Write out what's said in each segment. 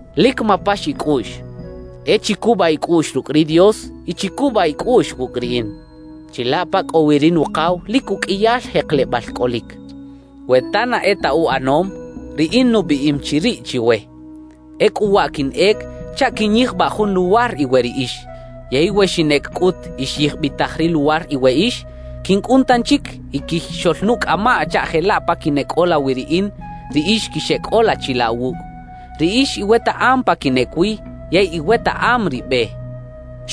»Lic mapax icꞌuꞌx. E chicubaꞌ icꞌuꞌx rucꞌ ri Dios y chicubaꞌ icꞌuꞌx wucꞌ riꞌin. Chilaꞌ pa cꞌo wi ri Nukaw lic uqꞌuiyal jeklebal cꞌolic. We ta na e ta uꞌanom, riꞌin nubiꞌim chi riꞌ chiwe. Ecꞌu waꞌ quinꞌec chaꞌ quiꞌnyijbaꞌ jun luwar iwe riꞌix. Yey we xinꞌec cꞌut y xyijbitaj ri luwar iweꞌix, quincꞌun tanchic y quixoꞌlnucꞌamaꞌ chaꞌ jelaꞌ pa quineꞌcꞌola wi riꞌin, riꞌix quixeꞌcꞌola chilaꞌ wucꞌ. Riꞌix iwetaꞌam pa quinꞌec wi yey iwetaꞌam ri be —xchaꞌ.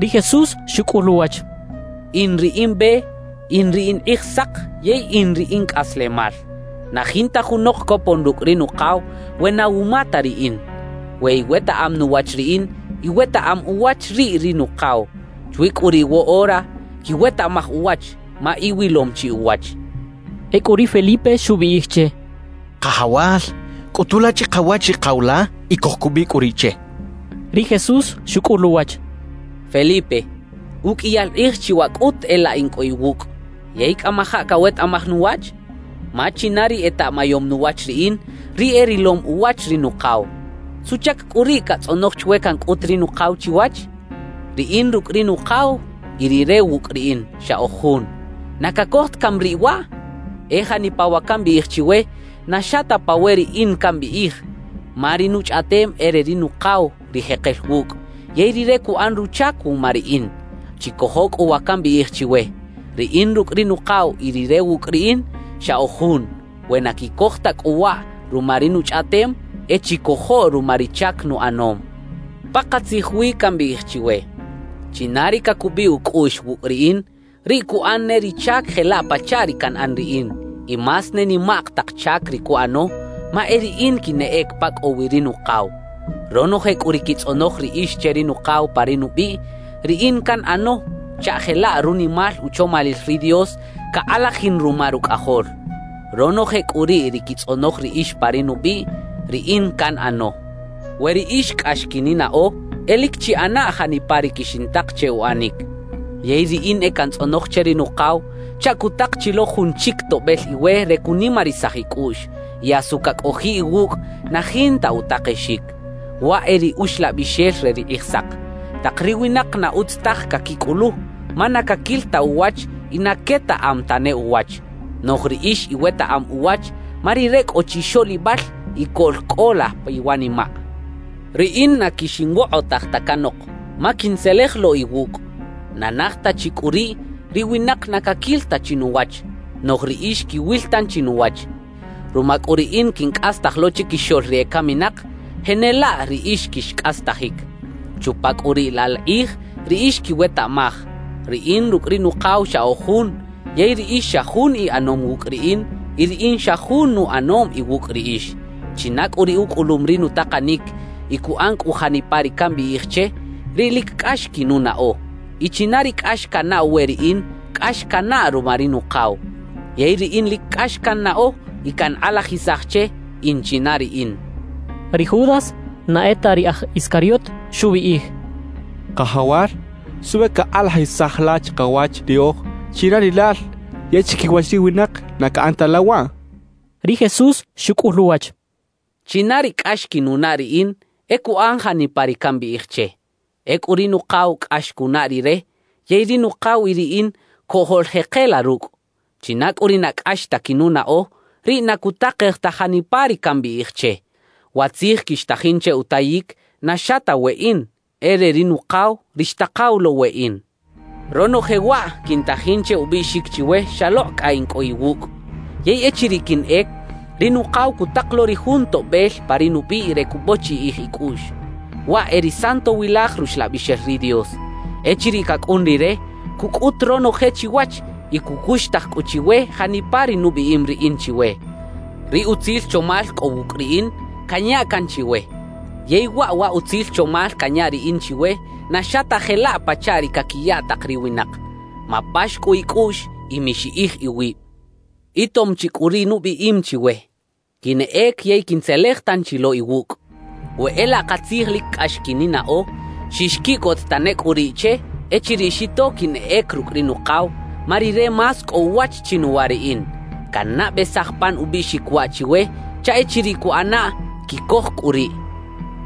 Ri Jesús xucꞌul uwach: —In ri in Be, in ri in Kꞌijsak yey in ri in Cꞌaslemal. Na jinta junok copon rucꞌ ri Nukaw we na wuma ta riꞌin. We iwetaꞌam nuwach riꞌin, iwetaꞌam uwach riꞌ ri Nukaw. Chwi cꞌu riꞌ woꞌora quiwetaꞌmaj uwach, ma iwilom chi uwach —xchaꞌ. Ecꞌu ri Felipe xubiꞌij che: —Kajawal, cꞌutu la chikawach ri Kaw la y cojcubiꞌ cꞌu riꞌ che —xchaꞌ. Ri Jesús xucꞌul uwach: —Felipe, uqꞌuiyal kꞌij chi waꞌ cꞌut e laꞌ in cꞌo iwucꞌ, ¿yey cꞌamajaꞌ cawetaꞌmaj nuwach? Ma china ri etaꞌmayom nuwach riꞌin, riꞌ e rilom uwach ri Nukaw. ¿Suꞌchac cꞌu riꞌ catzꞌonoj chwe cancꞌut ri Nukaw chiwach? Riꞌin rucꞌ ri Nukaw y Rire wucꞌ riꞌin, xa oj jun. ¿Na cacoj ta cami riꞌ waꞌ? E janipa wa cambiꞌij chiwe, na xa ta pa we riꞌin cambiꞌij ma ri nuchꞌaꞌtem e re ri Nukaw ri jekel wucꞌ, yey Rire cuꞌan ruchac wuma riꞌin. Chicojo cꞌu wa cambiꞌij chiwe: Riꞌin rucꞌ ri Nukaw y Rire wucꞌ riꞌin, xa oj jun. We na quicoj ta cꞌu waꞌ ruma ri nuchꞌaꞌtem, e chicojo ruma ri chac nuꞌanom. »Pakatzij wi cambiꞌij chiwe: China ri cacubiꞌ ucꞌuꞌx wucꞌ riꞌin, riꞌ cuꞌan ne ri chac jelaꞌ pachaꞌ ri canꞌan riꞌin; y más ne nimak tak chac ri cuꞌano, ma e riꞌin quinꞌec pa cꞌo wi ri Nukaw. Ronoje cꞌu ri quitzꞌonoj riꞌix che ri Nukaw pa ri nubiꞌ, riꞌin canꞌano chaꞌ jelaꞌ runimal uchomalil ri Dios cakꞌalajin ruma Rucꞌajol. Ronoje cꞌu riꞌ ri quitzꞌonoj riꞌix pa ri nubiꞌ, riꞌin canꞌano. »We riꞌix cꞌax quininaꞌo, e lic chiꞌana janipa ri quixintak che uꞌanic. Yey riꞌin e cantzꞌonoj che ri Nukaw chaꞌ cutak chi lo jun chic Toꞌbel iwe re cunimarisaj icꞌuꞌx; y asu cacꞌojiꞌ iwucꞌ na jinta utakexic. Waꞌ e ri Uxlabixel re ri Kꞌijsak. Tak ri winak na utz taj caquicꞌulu, ma na caquil ta uwach y na quetaꞌam tane uwach. Noꞌj riꞌix iwetaꞌam uwach, ma Rire cꞌo chixoꞌlibal y coꞌlcꞌola piwanimaꞌ. »Riꞌin na quixinwokꞌotaj ta canok, ma quintzelej lo iwucꞌ. Na naj ta chi cꞌu riꞌ, ri winak na caquil ta chi nuwach; noꞌj riꞌix quiwil tanchi nuwach. Ruma cꞌu riꞌin quincꞌastaj lo chiquixoꞌl ri ecaminak, jenelaꞌ riꞌix quixcꞌastajic. Chupa cꞌu riꞌ laꞌ la kꞌij riꞌix quiwetaꞌmaj: Riꞌin rucꞌ ri Nukaw xa oj jun, yey riꞌix xa jun iꞌanom wucꞌ riꞌin y riꞌin xa jun nuꞌanom iwucꞌ riꞌix. China cꞌu ri ucꞌulum ri nutakanic y cuꞌan cꞌu janipa ri cambiꞌij che, riꞌ lic cꞌax quinunaꞌo. Y china ri cꞌax canaꞌw we riꞌin, cꞌax canaꞌ ruma ri Nukaw. Yey riꞌin lic cꞌax cannaꞌo y cankꞌalajisaj che, in china riꞌin —xchaꞌ. Ri Judas (na e ta ri aj Iscariot) xubiꞌij: —Kajawal, ¿suꞌbe cakꞌalajisaj la chikawach riꞌoj china rilal yey chiquiwach ri winak na caꞌan ta la waꞌ? —xchaꞌ. Ri Jesús xucꞌul uwach: —China ri cꞌax quinunaꞌ riꞌin, e cuꞌan janipa ri cambiꞌij che. Ecꞌu ri Nukaw cꞌax cunaꞌ rire, yey ri Nukaw y riꞌin cojoꞌljekela rucꞌ. China cꞌu ri na cꞌax ta quinunaꞌo, riꞌ na cutakej ta janipa ri cambiꞌij che. Wa tzij quixtajin che utayic, na xa ta weꞌin, e re ri Nukaw, ri xtakaw lo weꞌin. »Ronoje waꞌ quintajin che ubiꞌxic chiwe xalokꞌ cꞌa in cꞌo iwucꞌ. Yey echiriꞌ quinꞌec, ri Nukaw cutak lo ri jun Toꞌbel pa ri nubiꞌ re cubochiꞌij icꞌuꞌx, waꞌ e ri Santowilaj Ruxlabixel ri Dios. Echiriꞌ cacꞌun Rire, cucꞌut ronoje chiwach y cucuxtaj cꞌu chiwe janipa ri nubiꞌim riꞌin chiwe. »Ri utzil chomal cꞌo wucꞌ riꞌin, canya can chiwe. Yey waꞌ wa utzil chomal canya riꞌin chiwe na xa ta jelaꞌ pachaꞌ ri caquiya tak ri winak. Mapax cꞌu icꞌuꞌx y mixiꞌij iwib. »Itom chi cꞌu ri nubiꞌim chiwe: “Quinꞌec yey quintzelej tanchi lo iwucꞌ.” We e laꞌ katzij lic cꞌax quininaꞌo, xixquiꞌcot tane cꞌu riꞌ che echiriꞌ xito quinꞌec rucꞌ ri Nukaw, ma Rire más cꞌo uwach chinuwa riꞌin. »Cannabesaj pan ubiꞌxic waꞌ chiwe chaꞌ echiriꞌ cuꞌanaꞌ, quicoj cꞌu riꞌ.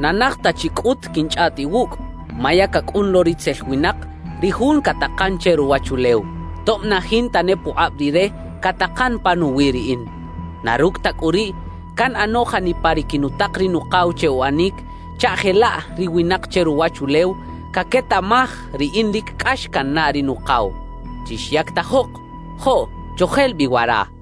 Na naj ta chi cꞌut quinchꞌaꞌt iwucꞌ; ma ya cacꞌun lo ritzel winak, ri jun catakan che ruwachulew, tob na jinta ne pukꞌab rire catakan panuwi riꞌin. Na rucꞌ ta cꞌu riꞌ, canꞌano janipa ri quinutak ri Nukaw che uꞌanic, chaꞌ jelaꞌ ri winak che ruwachulew caquetaꞌmaj riꞌin lic cꞌax cannaꞌ ri Nukaw. »Chixyactajok; joꞌ, chojel bi wara.